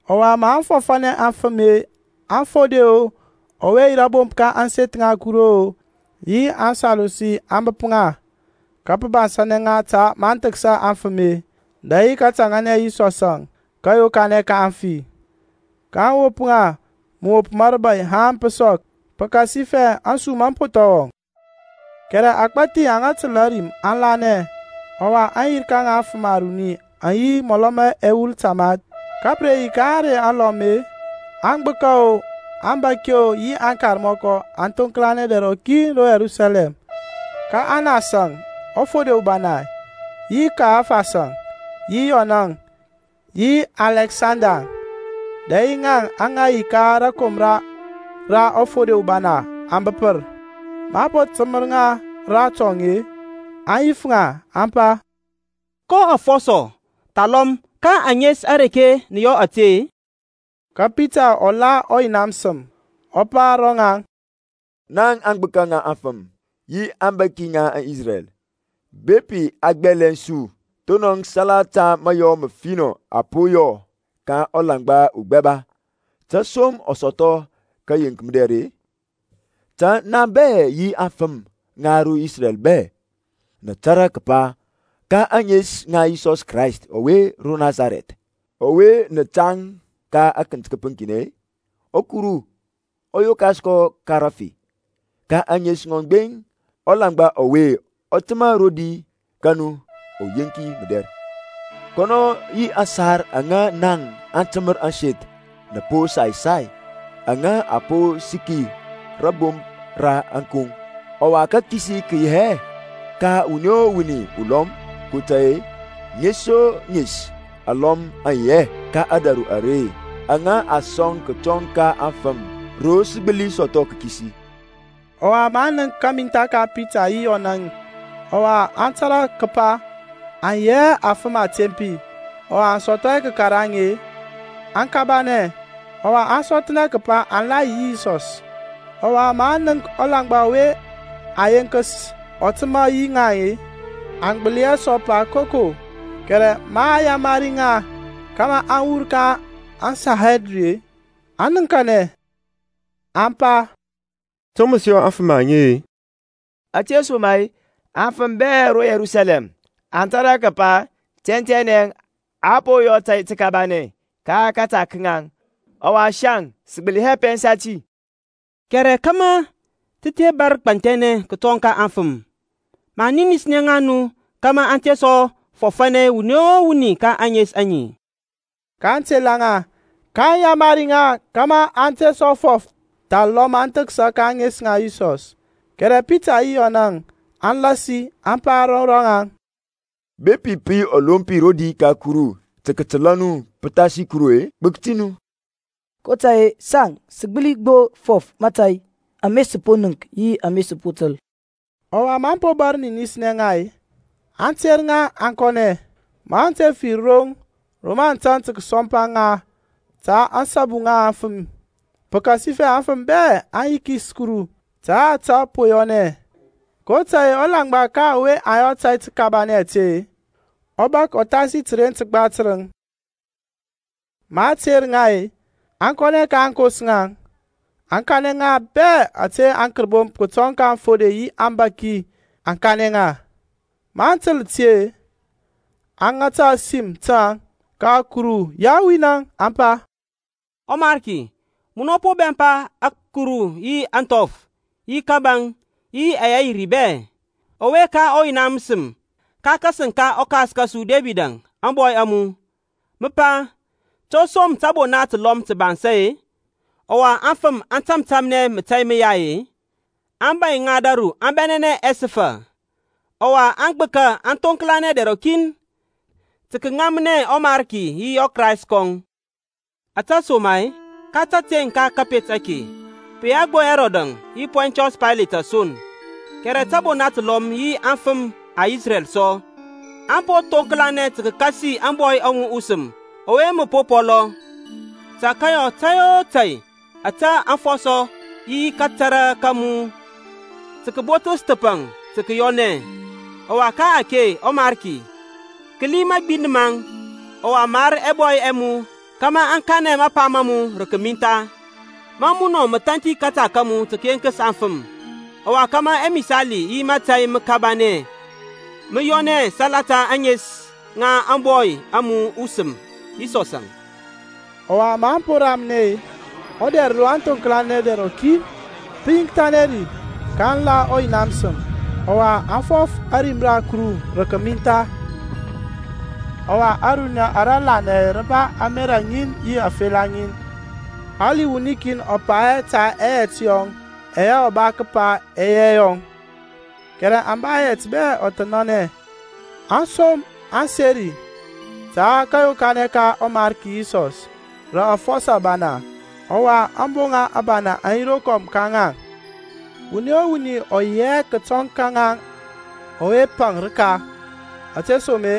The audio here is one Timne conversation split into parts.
Ɔwa maŋ fɔfȧnɛ aŋfəm-e, aŋfode-o, ɔwe yi rȧbomp ka ȧŋseth ŋa Kuru-o, yi aŋSadusi aŋ bəp ŋa, ka pə bansȧnɛ ŋa ta maŋ thəksa aŋfəm-e, dɛ yi kətȧŋȧnɛ Yisɔsȧŋ, kȧyokanɛ ka aŋfi. kaŋ wop ŋa mȧwop ma rȧbȧy haŋ pə sɔk, pəkasifɛ ȧŋsum aŋ po thɔŋ wɔŋ. Kɛrɛ agbȧthi aŋa təl ȧrim aŋ lanɛ; ɔwa aŋyirka ŋa aŋfəm aruni aŋ yi mɔlɔ ma ɛwul tamath. Ka pə re yi ka ȧŋrey alɔm-e, aŋgbəka-o, aŋbȧki-o, yi aŋkarmɔkɔ aŋ thoŋklanɛ dɛr rɔkin ro Yerusalɛm. Ka Anas-əŋ, ɔfode ubana, yi Kayafasȧŋ, yi Yɔnȧŋ, yi Alɛksandaŋ, dɛ yi ŋaŋ aŋa yi ka rȧkomra ra ɔfode ubana aŋ bəpər. Maŋ po təmər ŋa ratɔŋ-e, aŋ yif ŋa, aŋ pa, Ko afɔsɔ, thalɔm ka ȧŋes areke nə yɔ ȧte-e? Ka Pitaŋ ɔ la ɔYina məsəm, ɔ pa ro ŋaŋ, Naŋ agbəka ŋa aŋfəm, yi abȧki ŋa Isrɛl, bepi a gbɛlɛŋ su thonɔŋ salata mayɔ məfinɔ a po yɔ ka ulaŋgba ugbɛba, to som ɔ sɔthɔ kəyeŋk mədɛr-e; ta naŋ bɛ yi aŋfəm ŋa ro Isrɛl bɛ, nə tȧrȧ kəpa, ka ȧŋes ŋa Yisɔs Krayst ɔwe ro Nasarɛth ɔwe nə tȧŋ ka akənt kəpəŋkinɛ-e, ɔwe Kuru ɔ yokas ka rəfi, ka ȧŋes ŋɔŋ gbeŋ ɔlaŋgba ɔwe ɔ təmȧ rodi ka nu uyeŋki mədɛr. Kɔnɔ ɔ yi aŋsar aŋa naŋ atəmər ȧŋseth nə po sai sai, ŋa a po səki rȧbomp ra ȧŋkoŋ. Ɔwa kakisi kə yi hɛ ka wuni o wuni ulɔm, kotȧy-e, ŋes o ŋes alɔm aŋ yi hɛ ka ȧdȧru are aŋa a sɔŋ kətɔŋ ka aŋfəm ro sə gbəli sɔthɔ kakisi. Ɔwa maŋ nənk kamintha ka Pitaŋ yi Yɔnȧŋ, ɔwa aŋ tȧrȧ kəpa aŋ yi hɛ afəm atempi ɔwa aŋ sɔthɔ hɛ kəkaraŋ-e, aŋ kabanɛ; ɔwa aŋ sɔthnɛ kəpa aŋ la yi yi Yisɔs. Ɔwa maŋ nənk ɔlaŋgba ɔwe a yenkəs ɔ təmȧ yi ŋaŋ-e, aŋ gbəli hɛ sɔ pa koko. Kɛrɛ maŋ yamari ŋa kȧmȧ aŋ wur ka aŋSanhedrin aŋ nəŋkanɛ, aŋ pa, To mə sə yɔ aŋfəm aŋe-e, ȧtesoma-e aŋfəm bɛ ro Yerusalɛm aŋ tȧrȧ kəpa tɛntɛnɛ a po yɔ tȧy təkabanɛ ka kȧta ka ŋaŋ, ɔwa saŋ sə gbəli hɛ pɛnsa ti. Kɛrɛ kȧmȧ tə te bȧr gbanthɛnɛ kətɔŋ ka aŋfəm, maŋ ninisnɛ ŋa nu kȧmȧ aŋ te sɔ fɔfȧnɛ wuni o wuni ka ȧŋes aŋe. kaŋ tela ŋa, kaŋ yamari ŋa kȧmȧ aŋ te sɔ fɔf thalɔm aŋ thəksa ka ȧŋes ŋa Yisɔs. Kɛrɛ Pitaŋ yi Yɔnȧŋ aŋ lasi aŋ pa ro rɔŋaŋ, Bepi pə yi ɔlompi rodi ka Kuru tə kətəla nu pəthasi Kuru-e, gbək ti nu; kotȧy-e saŋ sə gbəli gbo fɔf mȧtȧy ama sə po nənk yi ama sə po təl. Ɔwa maŋ po bȧr ninisnɛ ŋa-e, aŋ tera ŋa aŋ kɔnɛ, maŋ te fir roŋ ro mə aŋ tȧŋ tə kəsɔmpa ŋa ta ȧŋsabu ŋa aŋfəm, pəkasifɛ aŋfəm bɛ aŋ yikis Kuru ta ȧtȧ po yɔnɛ. kotȧy-e ɔlaŋgba ka ɔwe a yɔ ȧtȧy təkabanɛ ȧte; ɔ bȧk ɔthasi təren təgba tərəŋ. Ma a tera ŋa-e, aŋ kɔnɛ ka aŋkos ŋaŋ, aŋ kanɛ ŋa bɛ ȧte aŋkərbomp kətɔŋ ka aŋfode yi aŋbȧki aŋ kanɛ ŋa. Maŋ təl ti-e, aŋ ŋata ȧsim taŋ ka Kuru yawin-əŋ, aŋ pa, ƆMariki, munɔ po bɛmpa ȧkuru yi ȧŋthɔf, yi kȧbȧŋ, yi ɛyɛ yi ri bɛ; ɔwe ka ɔYina məsəm ka kȧsəŋ ka ɔkas kȧsu Debidȧŋ ȧŋbɔy a mu, mə pa, To som tȧbona təlɔm tə bansȧ-e? Ɔwa aŋfəm aŋ tȧmtȧmnɛ mȧtȧy məyai-e? aŋbȧy ŋa ȧdȧru aŋ bɛnɛnɛ ɛsəfa, Ɔwa aŋgbəka aŋ thoŋklanɛ dɛr rɔkin, Tə kəŋamnɛ ɔMarki yi ɔKrayst kɔŋ; ȧtesoma-e ka təteŋ ka kȧpet ake pə yi hɛ gbo Hɛrɔdȧŋ yi Pɔntiɔs Paylet son, kɛrɛ təbona təlɔm yi aŋfəm ŋa Isrɛl sɔ, aŋ po thoŋklanɛ tə kəkȧsi Yisɔsȧŋ ȧŋBɔy a mu usəm ɔwe mə po pɔlɔ tə kəyɔ tȧy o tȧy ȧtȧ aŋfɔsɔ yi kȧtȧrȧ ka mu kə botəs thəpaŋ tə kəyɔnɛ. Ɔwa ka-ake ɔMarki, kəli mȧgbind maŋ, ɔwa mar ɛbɔy ɛ mu kȧmȧ aŋ kanɛ mapa ma mu rə kəmintha, ma munɔ mə thanthi kȧta ka mu tə kəyeŋkəs afəm; ɔwa kȧmȧ ɛmisali yi mȧtȧy məkabanɛ mə yɔnɛ salata ȧŋes ŋa ȧŋBɔy a mu usəm Yisɔsȧŋ. Ɔwa maŋ po ramnɛ-e, ɔdɛr ro aŋ thoŋklanɛ dɛr rɔkin-e, pə yiŋkthanɛ ri, kaŋ la ɔYina məsəm, ɔwa aŋ fɔf ȧrim ra Kuru rə kəmintha. Ɔwa ȧruniya ara lanɛ rə ba ȧmerȧ ŋin yi afela ŋin; hali wuni kin ɔ pa hɛ ta ɛyɛt yɔŋ ɛyɛ ɔ ba kəpa ɛ yi ɛyɔŋ, kɛrɛ aŋ ba ɛyɛt bɛ ɔthənanɛ. Aŋsom aŋ seri ta kȧyokanɛ ka ɔMarki Yisɔs rə afɔsɔ abana; ɔwa aboŋa abana aŋ yi rokɔm ka ŋaŋ. Wuni o wuni ɔ yi hɛ kətɔŋ ka ŋaŋ ɔwe paŋ rəka ȧtesoma-e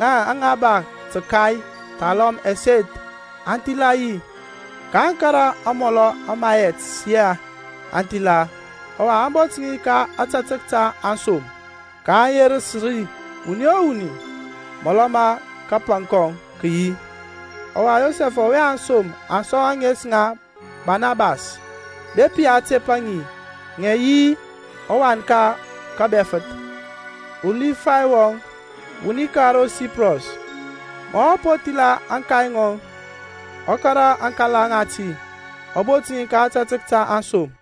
ŋaŋ aŋa ba təkai thalɔm ɛseth aŋ thila yi, kaŋ kȧrȧ amɔlɔ ma ɛyɛt ɛyɛ aŋ thila, ɔwa aŋ bot ŋi ka ȧtȧtək ta aŋsom, kaŋ yerəs rə wuni o wuni mɔlɔ ma kapaŋ kɔŋ kə yi. Ɔwa Yosɛfȧŋ ɔwe aŋsom aŋ sɔŋ ȧŋes ŋa Barnabas, (bepi a tepa ŋi ŋə yi Wan ka kȧBɛfəth), uLifay wɔŋ, wuni ka ro Siprɔs, ma ɔ po thila ȧŋkay ŋɔŋ, ɔ kȧrȧ aŋkala ŋati, ɔ bot ŋi ka ȧtȧtək ta aŋsom.